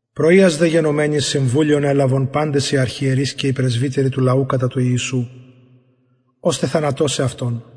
πρωιας δε γενομενης συμβουλιον ελαβον παντες οι αρχιερεις και οι πρεσβυτεροι του λαου κατα του ιησου ωστε θανατωσαι αυτον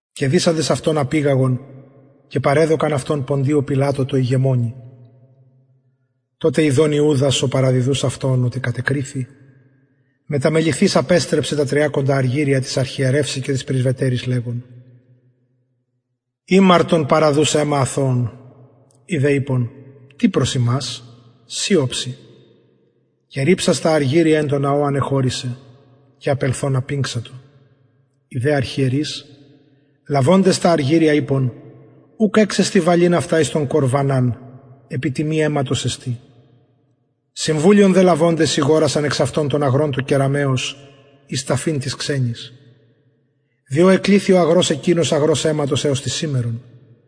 και δησαντες αυτον απηγαγον και παρεδωκαν αυτον ποντιω πιλατω τω ηγεμονι τοτε ιδων ιουδας ο παραδιδους αυτον οτι κατεκριθη μεταμεληθεις απεστρεψεν τα τριακοντα αργυρια τοις αρχιερευσιν και τοις πρεσβυτεροις λεγων ημαρτον παραδους αιμα αθωον οι δε ειπον τι προς ημας συ οψει και ριψας τα αργυρια εν τω ναω ανεχωρησεν και απελθων απηγξατο οι δε αρχιερεις λαβοντες τα αργυρια ειπον ουκ εξεστιν βαλειν αυτα εις τον κορβαναν επει τιμη αιματος εστιν συμβουλιον δε λαβοντες ηγορασαν εξ αυτων τον αγρον του κεραμεως εις ταφην τοις ξενοις διο εκληθη ο αγρος εκεινος αγρος αιματος εως της σημερον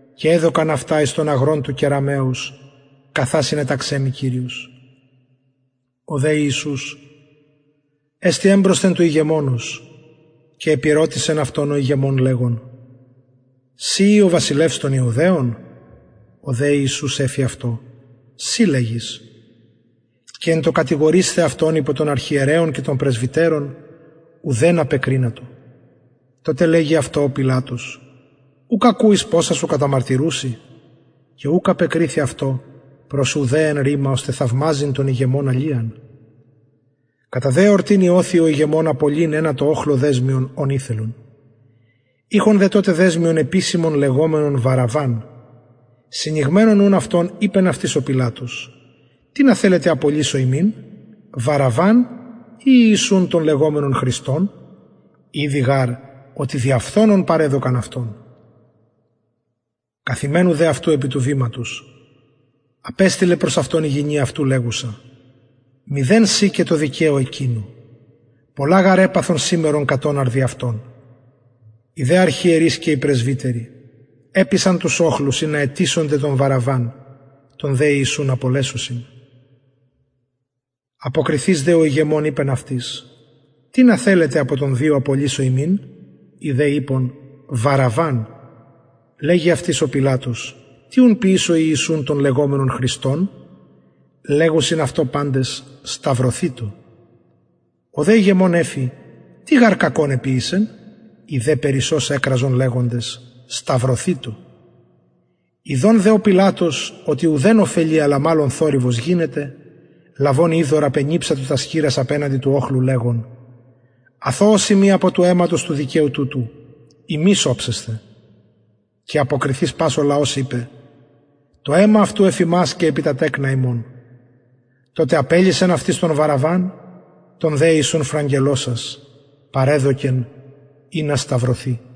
και εδωκαν αυτα εις τον αγρον του κεραμεως καθα συνεταξεν μοι κυριος ο δε ιησους εστη εμπροσθεν του ηγεμονος και επηρωτησεν αυτον ο ηγεμων λεγων συ ει ο βασιλευς των ιουδαιων ο δε ιησους εφη αυτω συ λεγεις και εν τω κατηγορεισθαι αυτον υπο των αρχιερεων και των πρεσβυτερων ουδεν απεκρινατο τοτε λεγει αυτω ο πιλατος ουκ ακουεις ποσα σου καταμαρτυρουσιν και ουκ απεκριθη αυτω προς ουδε εν ρημα ωστε θαυμαζειν τον ηγεμονα λιαν κατα δε εορτην ειωθει ο ηγεμων απολυειν ενα τω οχλω δεσμιον ον ηθελον ειχον δε τοτε δεσμιον επισημον λεγομενον βαραββαν συνηγμενων ουν αυτων ειπεν αυτοις ο πιλατος τινα θελετε απολυσω υμιν βαραββαν η ιησουν τον λεγομενον χριστον ηδει γαρ οτι δια φθονον παρεδωκαν αυτον καθημενου δε αυτου επι του βηματος απεστειλεν προς αυτον η γυνη αυτου λεγουσα μηδεν σοι και τω δικαιω εκεινω πολλα γαρ επαθον σημερον κατ οναρ δι αυτον οι δε αρχιερεις και οι πρεσβυτεροι επεισαν τους οχλους ινα αιτησωνται τον βαραββαν τον δε ιησουν απολεσωσιν αποκριθεις δε ο ηγεμων ειπεν αυτοις τινα θελετε απο των δυο απολυσω υμιν οι δε ειπον βαραββαν λεγει αυτοις ο πιλατος τι ουν ποιησω ιησουν τον λεγομενον χριστον λεγουσιν αυτω παντες σταυρωθητω ο δε ηγεμων εφη τι γαρ κακον εποιησεν οι δε περισσως εκραζον λεγοντες σταυρωθητω ιδων δε ο πιλατος οτι ουδεν ωφελει αλλα μαλλον θορυβος γινεται λαβων υδωρ απενιψατο τας χειρας απεναντι του οχλου λεγων αθωος ειμι απο του αιματος του δικαιου τουτου υμεις οψεσθε και αποκριθεις πας ο λαος ειπεν το αιμα αυτου εφ ημας και επι τα τεκνα ημων τοτε απελυσεν αυτοις τον βαραββαν τον δε ιησουν φραγελλωσας παρεδωκεν ινα σταυρωθη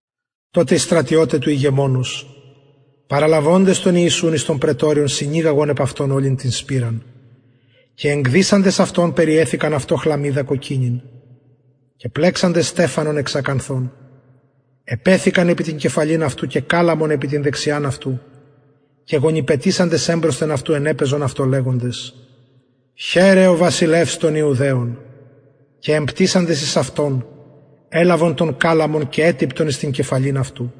τοτε οι στρατιωται του ηγεμονος παραλαβοντες τον ιησουν εις το πραιτωριον συνηγαγον επ αυτον ολην την σπειραν και εκδυσαντες αυτον περιεθηκαν αυτω χλαμυδα κοκκινην και πλεξαντες στεφανον εξ ακανθων επεθηκαν επι την κεφαλην αυτου και καλαμον επι την δεξιαν αυτου και γονυπετησαντες εμπροσθεν αυτου ενεπαιζον αυτω λεγοντες χαιρε ο βασιλευς των ιουδαιων και εμπτυσαντες εις αυτον ελαβον τον καλαμον και ετυπτον εις την κεφαλην αυτου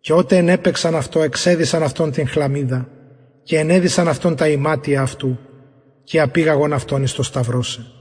και οτε ενεπαιξαν αυτω εξεδυσαν αυτον την χλαμυδα και ενεδυσαν αυτον τα ιματια αυτου και απηγαγον αυτον εις το σταυρωσαι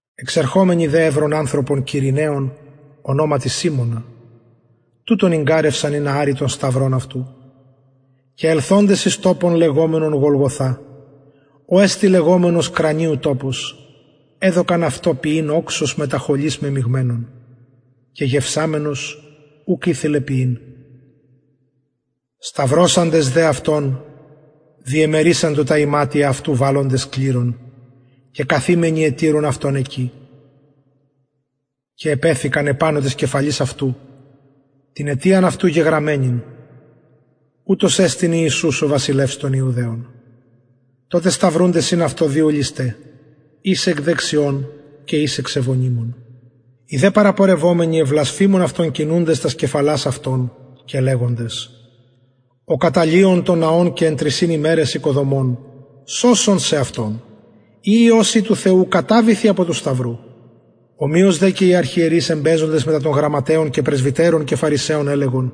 εξερχομενοι δε ευρον ανθρωπον κυρηναιον ονοματι σιμωνα τουτον ηγγαρευσαν ινα αρη τον σταυρον αυτου και ελθοντες εις τοπον λεγομενον γολγοθα ο εστιν λεγομενος κρανιου τοπος εδωκαν αυτω πιειν οξος μετα χολης μεμιγμενον και γευσαμενος ουκ ηθελεν πιειν σταυρωσαντες δε αυτον διεμερισαντο τα ιματια αυτου βαλλοντες κληρον και καθημενοι ετηρουν αυτον εκει και επεθηκαν επανω της κεφαλης αυτου την αιτιαν αυτου γεγραμμενην ουτος εστιν ιησους ο βασιλευς των ιουδαιων τοτε σταυρουνται συν αυτω δυο λησται εις εκ δεξιων και εις εξ ευωνυμων οι δε παραπορευομενοι εβλασφημουν αυτον κινουντες τας κεφαλας αυτων και λεγοντες ο καταλυων τον ναον και εν τρισιν ημεραις οικοδομων σωσον σεαυτον ει υιος ει του θεου καταβηθι απο του σταυρου ομοιως δε και οι αρχιερεις εμπαιζοντες μετα των γραμματεων και πρεσβυτερων και φαρισαιων ελεγον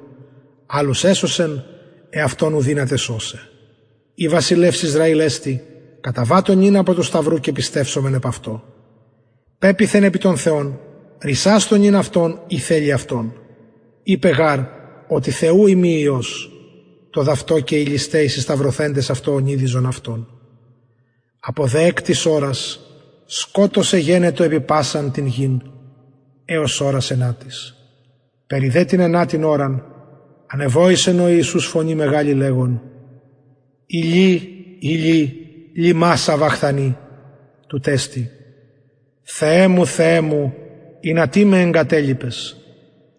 αλλους εσωσεν εαυτον ου δυναται σωσαι ει βασιλευς ισραηλ εστιν καταβατω νυν απο του σταυρου και πιστευσομεν επ αυτω πεποιθεν επι τον θεον ρυσασθω νυν αυτον ει θελει αυτον ειπεν γαρ οτι θεου ειμι υιος το δ αυτο και οι λησται οι συσταυρωθεντες αυτω ωνειδιζον αυτον απο δε εκτης ωρας σκοτος εγενετο επι πασαν την γην εως ωρας ενατης περι δε την ενατην ωραν ανεβοησεν ο ιησους φωνη μεγαλη λεγων ηλι ηλι λιμα σαβαχθανι τουτ εστιν θεε μου θεε μου ινα τι με εγκατελιπες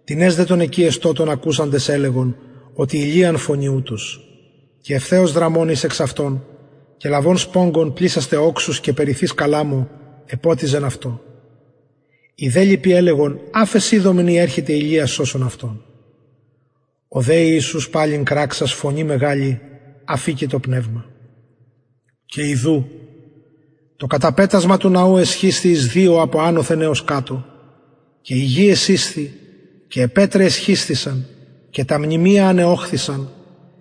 τινες δε των εκει εστωτων ακουσαντες ελεγον οτι ηλιαν φωνει ουτος και ευθεως δραμων εις εξ αυτων και λαβων σπογγον πλησας τε οξους και περιθεις καλαμω εποτιζεν αυτον οι δε λοιποι ελεγον αφες ιδωμεν ει ερχεται ηλιας σωσων αυτον ο δε ιησους παλιν κραξας φωνη μεγαλη αφηκεν το πνευμα και ιδου το καταπετασμα του ναου εσχισθη εις δυο απο ανωθεν εως κατω και η γη εσεισθη και αι πετραι εσχισθησαν και τα μνημεια ανεωχθησαν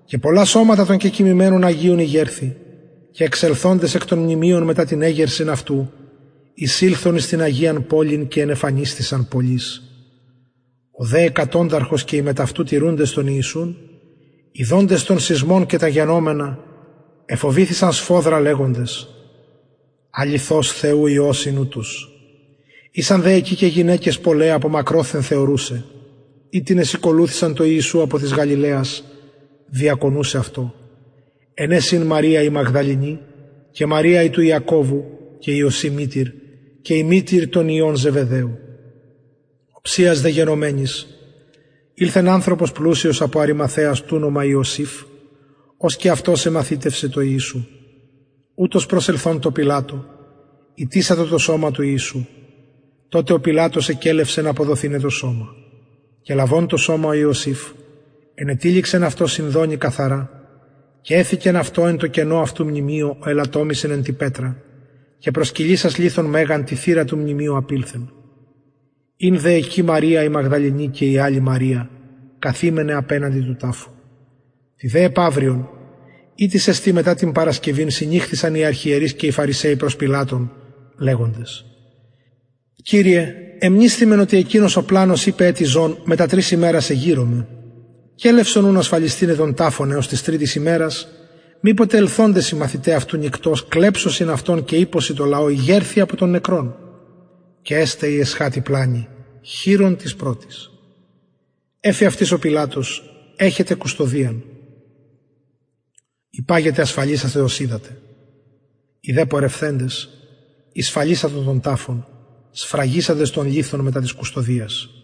και πολλα σωματα των κεκοιμημενων αγιων ηγερθη και εξελθοντες εκ των μνημειων μετα την εγερσιν αυτου εισηλθον εις την αγιαν πολιν και ενεφανισθησαν πολλοις ο δε εκατονταρχος και οι μετ αυτου τηρουντες τον ιησουν ιδοντες τον σεισμον και τα γενομενα εφοβηθησαν σφοδρα λεγοντες αληθως θεου υιος ην ουτος ησαν δε εκει γυναικες πολλαι απο μακροθεν θεωρουσαι αιτινες ηκολουθησαν τω ιησου απο της γαλιλαιας διακονουσαι αυτω εν αις ην μαρια η μαγδαληνη και μαρια η του ιακωβου και ιωση μητηρ και η μητηρ των υιων ζεβεδαιου οψιας δε γενομενης ηλθεν ανθρωπος πλουσιος απο αριμαθαιας τουνομα ιωσηφ ος και αυτος εμαθητευσεν τω ιησου ουτος προσελθων τω πιλατω ητησατο το σωμα του ιησου τοτε ο πιλατος εκελευσεν αποδοθηναι το σωμα και λαβων το σωμα ο ιωσηφ ενετυλιξεν αυτο σινδονι καθαρα και εθηκεν αυτο εν τω καινω αυτου μνημειω ο ελατομησεν εν τη πετρα και προσκυλισας λιθον μεγαν τη θυρα του μνημειου απηλθεν ην δε εκει μαρια η μαγδαληνη και η αλλη μαρια καθημεναι απεναντι του ταφου τη δε επαυριον ητις εστιν μετα την παρασκευην συνηχθησαν οι αρχιερεις και οι φαρισαιοι προς πιλατον λεγοντες κυριε εμνησθημεν οτι εκεινος ο πλανος ειπεν ετι ζων μετα τρεις ημερας εγειρομαι κελευσον ουν ασφαλισθηναι τον ταφον εως της τριτης ημερας μηποτε ελθοντες οι μαθηται αυτου νυκτος κλεψωσιν αυτον και ειπωσιν τω λαω ηγερθη απο των νεκρων και εσται η εσχατη πλανη χειρων της πρωτης εφη δε αυτοις ο πιλατος εχετε κουστωδιαν υπαγετε ασφαλισασθε ως οιδατε οι δε πορευθεντες ησφαλισαντο τον ταφον σφραγισαντες τον λιθον μετα της κουστωδιας